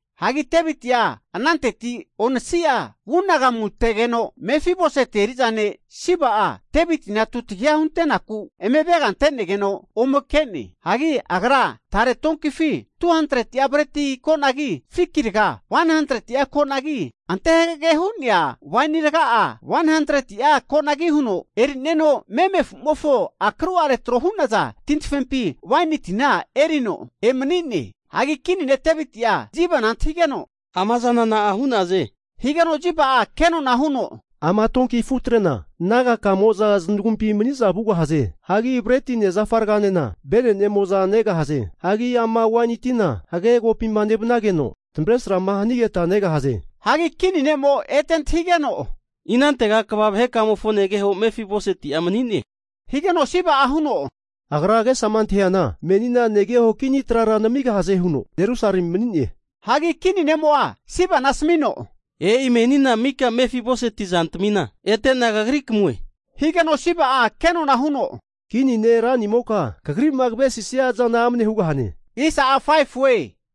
Hagi Deviti'a ananteti onasi'a vugamanu ategeno, Mefiboseti eri'za ne' Siba'a Devitina tutagiha hunte'naku eme avega antenegeno ome ke'ne. Hagi agra tare donkifi 200'a breti konagi, fiki raga 100'a konagi, ante hagage hu'nea waini raga'a 100'a konagi huno erineno meme afumofo akru'are tro hu'naza tintafempi waini tina erino emani'ne. Hagi kini ne Deviti'a Sibana antahigeno, amazana na'a hu'zane? Higeno Siba'a kenona huno, ama donki afutrena naga kamo'za zanagumpi mani'za vugahaze. Hagi bretine zafa raganena venenemo'za negahaze. Hagi ama waini tina hagage kopima nevanageno tamavresrama hanigeta negahaze. Hagi kini ne'mo ete antahigeno, inantega kva vahekamofo negeho Mefiboseti'a mani'ne? Higeno Siba'a huno, Agra agesama antahiana menina negeho kini trara namigahaze huno Jerusalemi mani'ne. Hagi kini ne'mo'a Sibana asamino, E'i menina maka Mefiboseti zantamina ete'na kagri kamue. Higeno Siba'a kenona huno, kini ne' ranimoka kagri'ma kavesisia zana amne hugahue.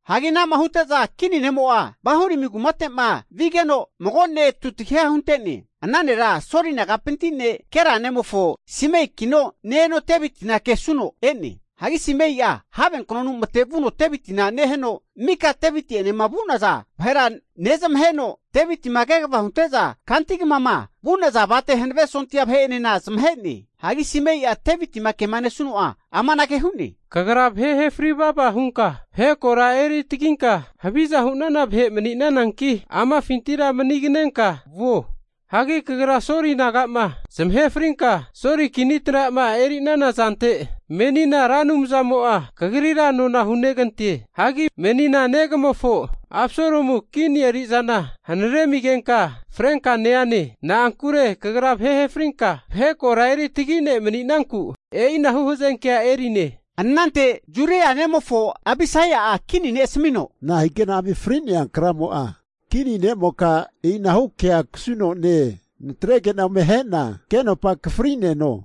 Hagi anama hute'za kini ne'mo'a Bahurimi kumate'ma vigeno, mago ne'mo tutagiha hunte'ne. Ana nera Soli nagapinti ne' Gera nemofo Simeikino ne-eno Devitina kesuno e'ne. Hagi Simei'a have knonu matevuno Devitina neheno, mika Deviti'enema vu'naza vahera nezamaheno, Devitima kegavama hunte'za kanti kamama vu'naza avate hanave sondia vahe'enena zamahe'ne. Hagi Simei'a Devitima kema nesuno'a amanage hu'ne, Kagra vahe ahe fri vava hunka vahe kora eri taginka haviza hu'nana vahe mani'nananki, amafintira maniganenka vuo. Hagi kagra Soli naga'ma zamahe frinka, Soli kini trama eri'nana zante menina Ra Anumzamo'a kagrira nona hunegante. Hagi menina negamofo Absalomu kini eri'zana hanare amigenka, frenka ne'ane. Na'ankure kagra vahe zamahe frinka vahe kora eritagi ne' mani'nanku, e'inahu hazenkea eri'ne. Anante Zeruia nemofo Abisai'a kini ne' asamino, nahigeno ami fri'nea kramo'a kini ne'moka e'inahu kea kasuno ne-e! Natrege'na ome ahena agenopa akafri'neno.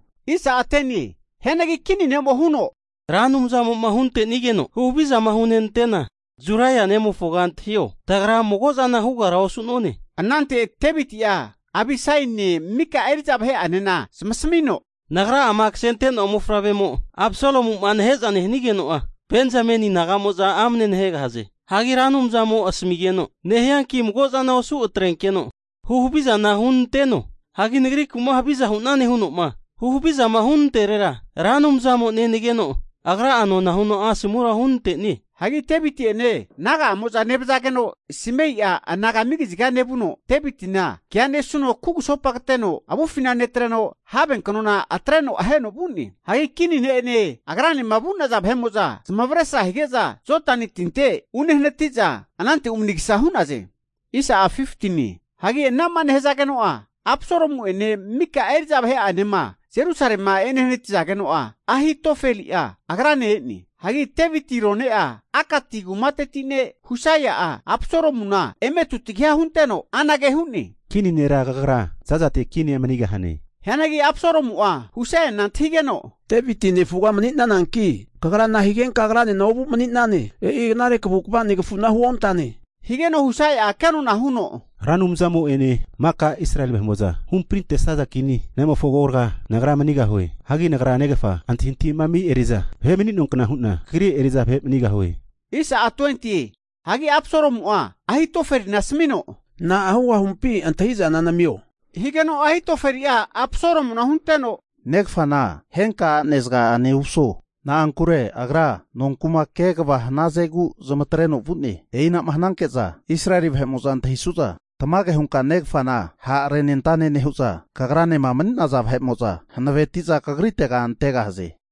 Hianagi kini ne'mo huno, Ra Anumzamo'ma huntenigeno huhavizama hunenante'na Zeruia nemofoga antahio, tagra magozana hugara osu'none. Anante Deviti'a Abisaine mika eri'za vahe'anena zamasamino, Nagra'ama kasente'noa mofavremo Absalomu'ma nahe'za nehanigeno'a, Benzameni naga'mo'za amane nahegahaze. Hagi Ra Anumzamo asamigeno nehianki, mago'zana osu atrenkeno huhavizana hunanteno. Hagi nagriku'ma haviza hunane huno'ma huhavizama hunanterera, Ra Anumzamo'a nenageno, Agra'a nona huno asomura hunante'nie. Hagi Deviti'ene naga'amo'za nevazageno Simei'a anagami kaziga nevuno, Devitina kea nesuno kugusopa kateno avufina netreno have kanona atreno aheno vu'ne. Hagi kini ne'ene agranema vu'naza vahe'mo'za zamavaresra hige'za Jodani tinte unehanati'za anante umanigasa hu'naze. Hagi ana'ma nehazageno'a, Absalomu'ene maka eri'za vahe'anema Jerusalema ehanati'zageno'a Ahitofeli'a agrane e'ne. Hagi Deviti rone'a Akati kumateti ne' Husai'a Absalomuna eme tutagiha hunteno anage hu'ne, Kini nera kagra zazate kinia manigahane! Hianagi Absalomu'a Husaina antahigeno, Deviti nefuga mani'nananki, kagra nahigenka agranena ovu mani'nane? E'i knare kavukvara negafuna huontane. Higeno Husai'a kenona huno, Ra Anumzamo'ene maka Israeli vahe'mo'za huhamprintesaza kini nemofo agoraga nagra manigahue. Hagi nagra negafa antahintahima ami eri'za vahe mani'noankna hu'na kagri eri'za vahe manigahue. Hagi Absalomu'a Ahitofelina asamino, Na'a hugahumpi antahi'zana namio. Higeno Ahitofeli'a Absalomuna hunteno, negafana henka a'nezaga'ane umaso. Na'ankure agra nonku'ma kegava hanazegu zamatreno vu'ne. E'inama hananke'za Israeli vahe'mo'za antahisu'za, tamage hunka negafana ha'renentane nehu'za, kagranema mani'naza vahe'mo'za hanaveti'za kagritega antegahaze.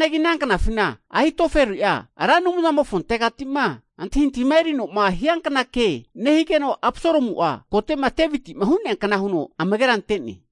Hagi ana knafina Ahitofeli'a Ra Anumzamofontegati'ma antahintahima erinoma hiankna ke nehigeno Absalomu'a kote'ma Deviti'ma hu'neankna huno amagera ante'ne.